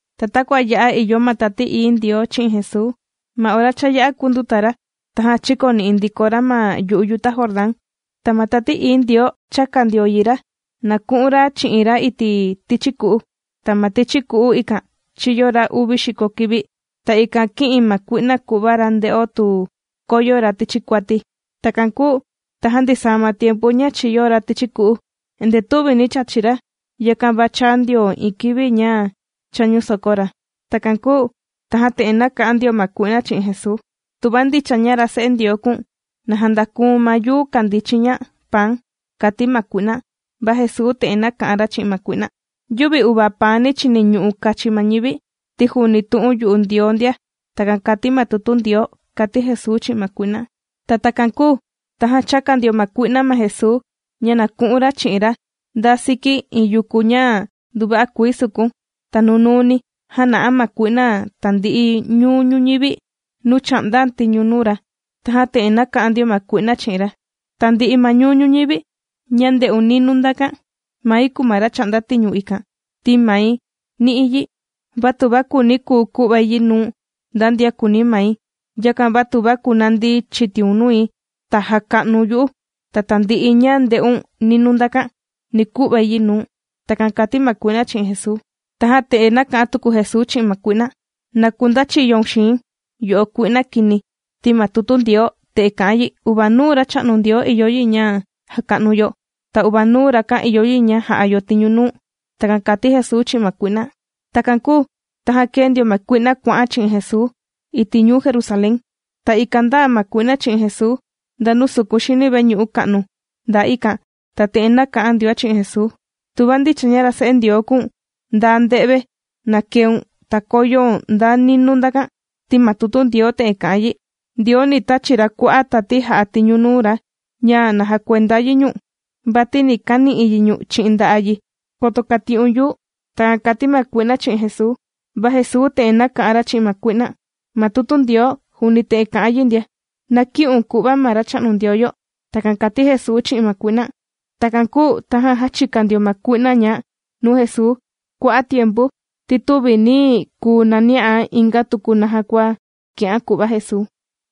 Ta takua ya'a ìyo ma Tati Ií Ndioo chi'in Jesuu, ma ora cha yā'a kūnduta ra, tajan chīkoni'i ndiko ra ma yu'u yuta Jordán, ta ma Tati Ií Ndioo chāka ndio yi ra na ku'un ra chi'in ra iti' tichi ku'u. Ta ma tichi ku'u ikan chīyo ra uvi xiko kivi. Ta ikan kī'in ma kui'na ku'va ra nde'o tu koyo ra tichi kuati. Takan kūu tajan ndisaa ma tiempu ña chīyo ra tichi ku'u, endee tüvi nī chachi ra, yakan va chāa ndio iin kivi ña chāñu soko ra. Takan kūu tajan te'en nāka'an ndio ma kui'na chi'in Jesuu: ―Tuva ndicha ña ra Se'e Ndioo kùu̱n, na jandakuu̱n ma yuu kàndii chiña paan ―kàti ma kui'na. Va Jesuu te'en nāka'an ra chi'in ma kui'na: ―“Yüvi uvaa paani chìniñu'u kachi ma ñivi, ti juuni tu'un yu'u Ndioo ndia”, takan kàti ma tutu Ndioo ―kàti Jesuu chi'in ma kui'na. Takan kūu tajan chāka ndio ma kui'na ma Jesuu ña na ku'un ra chi'in ra nda siki iin yuku ña nduva'a kuii sukun. Ta nunuuni jāna'a ma kui'na tandi'i ñuu ñuñivi nuu chà'ndán' tiñu nuu ra. Tajan te'en nāka'an ndio ma kui'na chi'in ra: ―Tandi'i ma ñuu ñuñivi ña ndè'un ninuu ndakan, mai kùu ma ra chà'nda tiñu ikan, ti mai nī'i yi. Va tuva kùuni̱, kùu ku'vai yi nuu nda ndian kùuni mai. Yakan va tuva kunandi chitiun nui, ta jaka'nu̱n yu'u, ta tandi'i ña ndè'un ninuu ndakan, ni ku'vai yi nuu̱n. ―Takan kàti ma kui'na chi'in Jesuu. Tajan te'en nāka'an tuku Jesuu chi'in ma kui'na: ―Na kundachiyoun xii̱n, yo'o kui'na kini, ti ma tutu Ndioo te'en kà'an yi: “Uvanuu Racha'nu Ndioo ìyo yi ña jaka'nu yo, ta uvanuu Rakan ìyo yi ña ja'a yo tiñu nuu.” ―Takan kàti Jesuu chi'in ma kui'na. Takan kūu tajan kēe ndio ma kui'na kuà'án' chi'in Jesuu iti' ñuu Jerusalén. Ta ikan ndāa ma kui'na chi'in Jesuu nda nuu sukun xini veñu'u ka'nu ndaa ikan. Ta te'en nāka'an ndioán' chi'in Jesuu: ―Tuva ndicha ña ra Se'e Ndioo kùu̱n, nda nde've na keun, ta koyoun nda ninuu ndakan, ti ma tutu Ndioo te'en kà'an yi: Ndioo ni tachi ra kua'a' tati jà'a tiñu nuu ra ña na jakuenda yi ñu̱n, vati ni kani'i yi ñu̱n chi'in nda'a' yi, koto kati'un yuu. ―Takan kàti ma kui'na chi'in Jesuu. Va Jesuu te'en nāka'an ra chi'in ma kui'na: ―Ma tutu Ndioo juuni te'en kà'an yi ndia: “Na kï'un ku'va ma Racha'nu Ndioo yo.” ―Takan kàti Jesuu chi'in ma kui'na. Takan kūu tajan jāchika ndio ma kui'na ñá' nuu Jesuu kua'a' tiempu, ti tüvi nī kuu nani'án' inga tuku naja kua kì'án' ku'va Jesuu.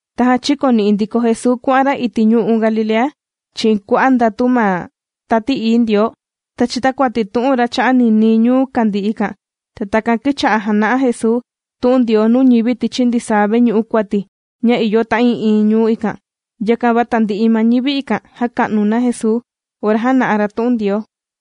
Tajan chīkoni'i ndiko Jesuu kuà'an ra iti' ñu'u' Galilea chi'in kua'a' ndatu ma Tati Ií Ndioo. Ta chītakuati tu'un cha'a' ra ninii ñuu kàndii ikan. Ta ikan kīcha'a jàna'a Jesuu tu'un Ndioo nuu ñivi tichi ndisaa veñu'u kuati ña ìyo ta'ii'iin ñuu ikan. Yakan va tandi'i ma ñivi ikan jàka'nu na Jesuu, ora jàna'a ra tu'un Ndioo.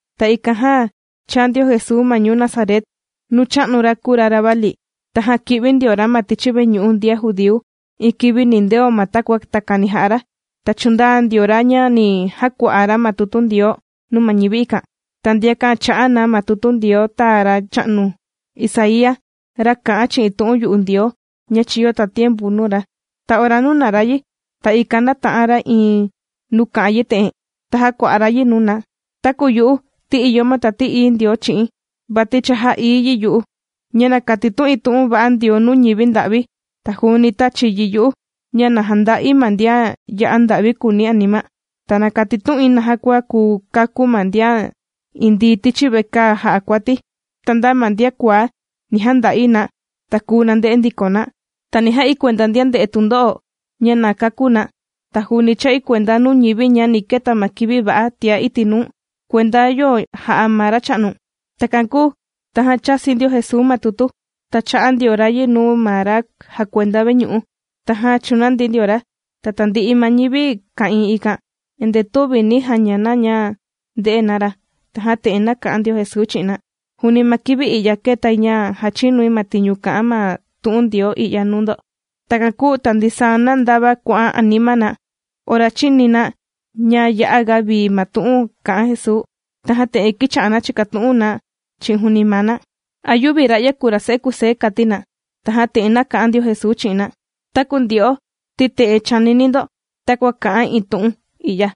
Ta ikan jan chāa ndio Jesuu ma ñuu Nazaret nuu chā'nu ra ora kūu ra ravali. Tajan kī'vi ndio ra ma tichi veñu'u ndian judíu iin kivi nindeo ma takua takani jà'a ra. Ta chūndaa ndio ra ña ni jàkua'a ra ma tutu Ndioo nuu ma ñivi ikan. Ta ndiakan chā'a na ma tutu Ndioo tāa racha'nu Isaía, ra kā'an chi'in tu'un yu'u Ndioo ña chīyo tatiempu nuu ra. Ta ora nūna ra yi, ta ikan nāta'an ra iin nuu kà'an yi te'en, ta jākua'a ra yi nuu na: Taku yu'u, ti ìyo ma Tati Ií Ndioo chi'i̱n, vati cha jā'ií yi yu'u, ña na katitu'in tu'un va'a Ndioo nuu ñivi nda'vi. Ta juuni tāchi yi yu'u ña na janda'i ma ndian ya'a nda'vi kuuni anima. Ta na katitu'in naja kua kùu kakú ma ndian indii tichi vekaa jà'a kuati, ta nda ma ndian kuaá ni janda'i na, ta kùu nande'e ndiko na. Ta ni ja'i kuenda ndian ndè'e tundo'o ña na kakú na. Ta juuni chà'i kuenda nuu ñivi ña ni keta ma kivi va'a tiá iti' nuu kuenda yo jà'a ma Racha'nu. Takan kūu tajan chāsi ndio Jesuu ma tutu, ta chā'a ndio ra yi nuu ma ra jàkuenda veñu'u, tajan chūnandi ndio ra. Ta tandi'i ma ñivi ka'ìin ikan, endee tüvi nī jaña na ña ndè'e na ra. Tajan te'en nāka'an ndio Jesuu chi'in na: ―Juuni ma kivi i'ya kētai ña jàchinui ma tiñu kà'an ma tu'un Ndioo i'ya nuu ndo. Takan kūu ta ndisaa na ndava kuà'an anima na ora chīni na ña ya'aga vii ma tu'un kā'an Jesuu. Tajan te'en kīcha'a na chìkatu'un na chi'in juuni maa na: ―¿A yüvi ra'ya kùu ra se'e Kusé? ―kàti na. Tajan te'en nāka'an ndio Jesuu chi'in na: ―Taku ndyo'o ti te'en chànini ndo takua kà'an iin tu'un i'ya: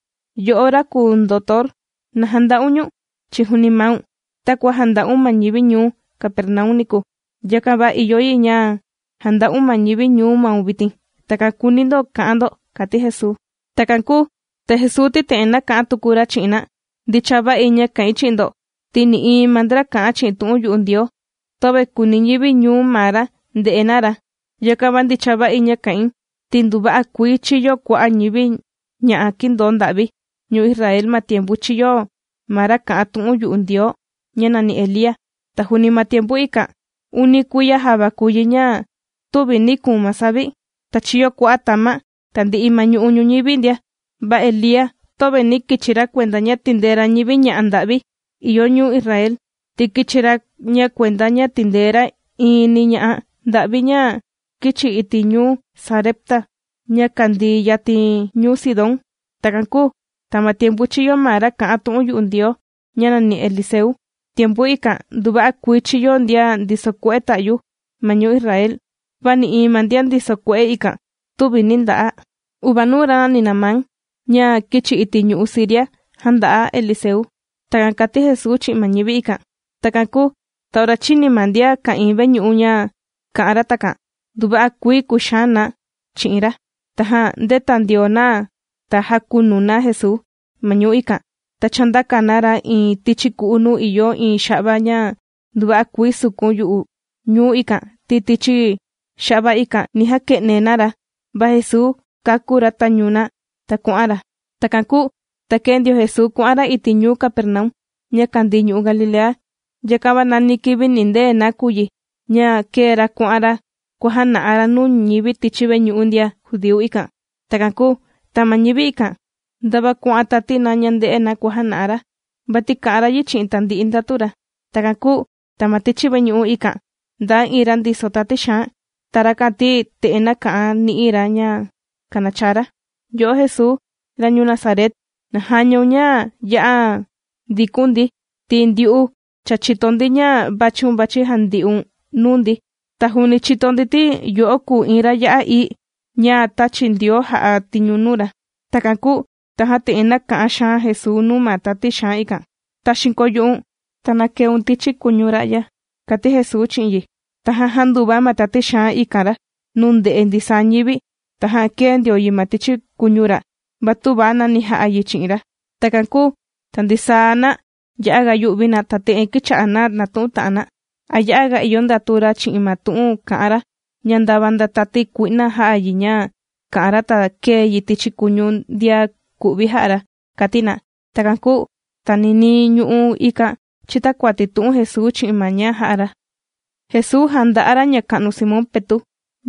“Yo'o ra kùu ndotor, na janda'un ñu̱n chi'in juuni maun.” Takua jānda'un ma ñivi ñuu Capernaum niku, yakan va ìyo yi ña janda'un ma ñivi ñuu maun vitin. Takan kùuni ndo ka'an ndo ―kàti Jesuu. Takan kūu ta Jesuu ti te'en nāka'an tuku ra chi'in na: ―Ndicha va'i ña kà'in chi'in ndo, ti nï'iin ma ndra kà'an chi'in tu'un yu'u Ndioo töve kùuni ñivi ñuu maa ra nde'e na ra. Yakan va ndicha va'i ña kà'in, ti nduva'a kuii chīyo kua'a' ñivi ña'a kīndoo nda'vi ñuu Israel ma tiempu chīyo ma ra kā'an tu'un yu'u Ndioo ña nàni Elía. Ta juuni ma tiempu ikan, uni kuiya java kùu yi ña tüvi nī kuun ma savi, ta chīyo kua'a' tama' tandi'i ma ñu'u' ñuñivi ndia. Va Elía, töve nī kichi ra kuenda ña tìndee ra ñivi ña'a nda'vi ìyo ñuu Israel, ti kīchi ra ña kuenda ña tìndee ra iini ña'a nda'vi ña kīchi iti' ñuu Sarepta, ña kàndii yatin ñuu Sidón. Takan kūu ta ma tiempu chīyo ma ra kā'an tu'un yu'u Ndioo ña nàni Eliseu. Tiempu ikan, nduva'a kuii chīyo ndian ndiso kue'e ta'yu ma ñuu Israel, va nï'iin ma ndian ndiso kue'e ikan tüvi nī nda'a. Uvanuu ra nàni Naamán ña kīchi iti' ñu'u' Siria, jānda'a Eliseu. ―Takan kàti Jesuu chi'in ma ñivi ikan. Takan kūu ta ora chīni ma ndian ka'ìin veñu'u ña kā'an ra takan nduva'a kuii kūxaan na chi'in ra. Tajan ndēta ndio na, ta jākunu na Jesuu, ma ñuu ikan, ta chāndaka na ra iin tichi ku'u nuu ìyo iin xa'va ña nduva'a kuii sukun yu'u ñuu ikan, ti tichi xa'va ikan, ni jake'ne na ra. Va Jesuu kākú ra tañu na, ta kuà'an ra. Takan kūu ta kēe ndio Jesuu kuà'an ra iti' ñuu Capernaum, ña kàndii ñu'u' Galilea. Yakan va nani kivi nìndee na kùu yi, ña kēe ra kuà'an ra kuàjana'a ra nuu ñivi tichi veñu'u ndian judíu ikan. Takan kūu ta ma ñivi ikan ndava kuà'an tati na ña ndè'e na naja kua jàna'a ra, vati kà'an ra yi chi'in tandi'i ndatu ra. Takan kūu ta ma tichi veñu'u ikan, ndaa iin ra ndiso tati xaan. Ta rakan ti te'en nāka'an ni'i ra ña kànachaa ra: ―Yo'o Jesuu ra ñuu Nazaret, na jañaun ña ya'a ndiku̱n ndi, ti ndyu'u cha chìto ndi ña vàchiun vàchi jandi'un nuu ndi. Ta juuni chìto ndi, ti yo'o kùu iin ra ya'a ií ña tāchi Ndioo jà'a tiñu nuu ra. Takan kūu tajan te'en nāka'an xaan Jesuu nuu ma tati xaan ikan: ―¡Taxiin koo yu'u̱n, ta na keun tichi kuñu ra'ya! ―kàti Jesuu chi'in yi. Tajan jānduva ma tati xaan ikan ra, nuu ndè'e ndisaa ñivi. Tajan kēe ndio yi ma tichi kuñu ra, va tüva nani ja'a yi chi'in ra. Takan kūu ta ndisaa na ya'aga yù'vi na, ta te'en kīcha'a na nàtu'un ta'an na: ―¿A ya'aga ìyo ndatu ra chi'in ma tu'un kà'an ra, ña ndava nda tati kui'na jà'a yi ña kà'an ra, ta kèe yi tichi kuñu ndian ku'vi jà'a ra? ―kàti na. Takan kūu ta ninii ñu'u' ikan chītakuati tu'un Jesuu chi'in ma ña jà'a ra. Jesuu jànda'a ra ñaka'nu Simón Petu'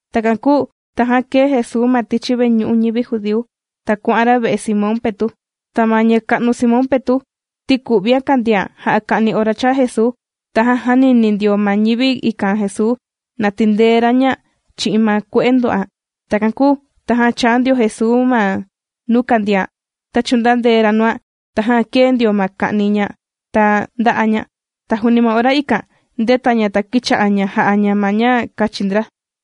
Takan kūu tajan kēe Jesuu ma tichi veñu'u ñivi judíu, ta kuà'an ra ve'e Simón Petu'. Ta ma ñaka'nu Simón Petu', ti ku'vian kàndian jà'a ka'ni ora chāa Jesuu. Tajan jānini ndio ma ñivi ikan Jesuu, na tindee ra ña chi'in ma kue'e ndò'an. Takan kūu tajan chāa ndio Jesuu ma nuu kàndian, ta chūndandee ra nuan. Tajan kēe ndio ma ka'ni ña, ta ndā'a ña. Ta juuni ma ora ikan ndēta ña ta kīcha'a ña jà'a ña ma ña kachi ndra.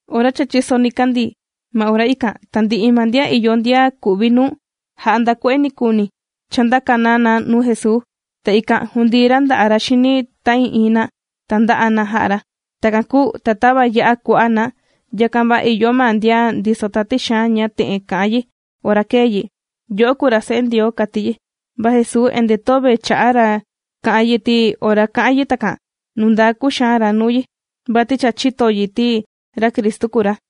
Ora cha chīso nikandii, ma ora ikan tandi'i ma ndian ìyo ndian ku'vi nuu, jà'a nda kue'e nikuuni, chāndaka na na nuu Jesuu. Ta ikan jūndii ra nda'a' ra xini ta'ii'iin na, ta ndā'a na jā'a ra. Takan kūu ta tava yà'a kua'a' na, yakan va ìyo ma ndian ndiso tati xaan ña te'en kà'an yi ora kèe yi: ―¡Yo'o kùu ra Se'e Ndioo! ―kàti yi. Va Jesuu endee töve chà'a ra kà'an yi, ti ora kà'an yi takan nundaa kuxaan ra nuu yi, vati cha chīto yi ti ra Cristu kùu ra.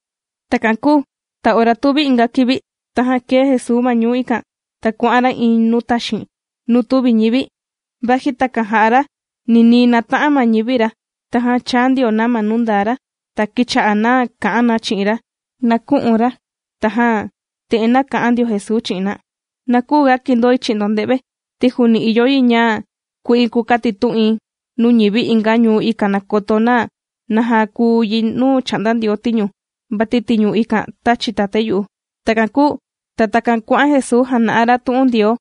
Takan kūu ta ora tuvi inga kivi, tajan kēe Jesuu ma ñuu ikan, ta kuà'an ra iin nuu taxiin nuu tüvi ñivi. Va vaji takan jā'a ra ninii nāta'an ma ñivi ra, tajan chāa ndio na ma nuu ndaa ra. Ta kīcha'a na kà'an na chi'in ra na kü'un ra. Tajan te'en nāka'an ndio Jesuu chi'in na: ―Na küuga kindoi chi'in ndo nde've, ti juuni ìyo yi ña ku'in kukatitu'in nuu ñivi inga ñuu, ikan na koto na naja kuu yi nuu chà'nda Ndioo tiñu. Vati tiñu ikan tāchi Tatái yu'u. Takan kūu ta takan kuà'an Jesuu jàna'a ra tu'un Ndioo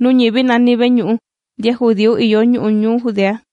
nuu ñivi nani veñu'u ndian judíu ìyo ñu'u' ñuu Judea.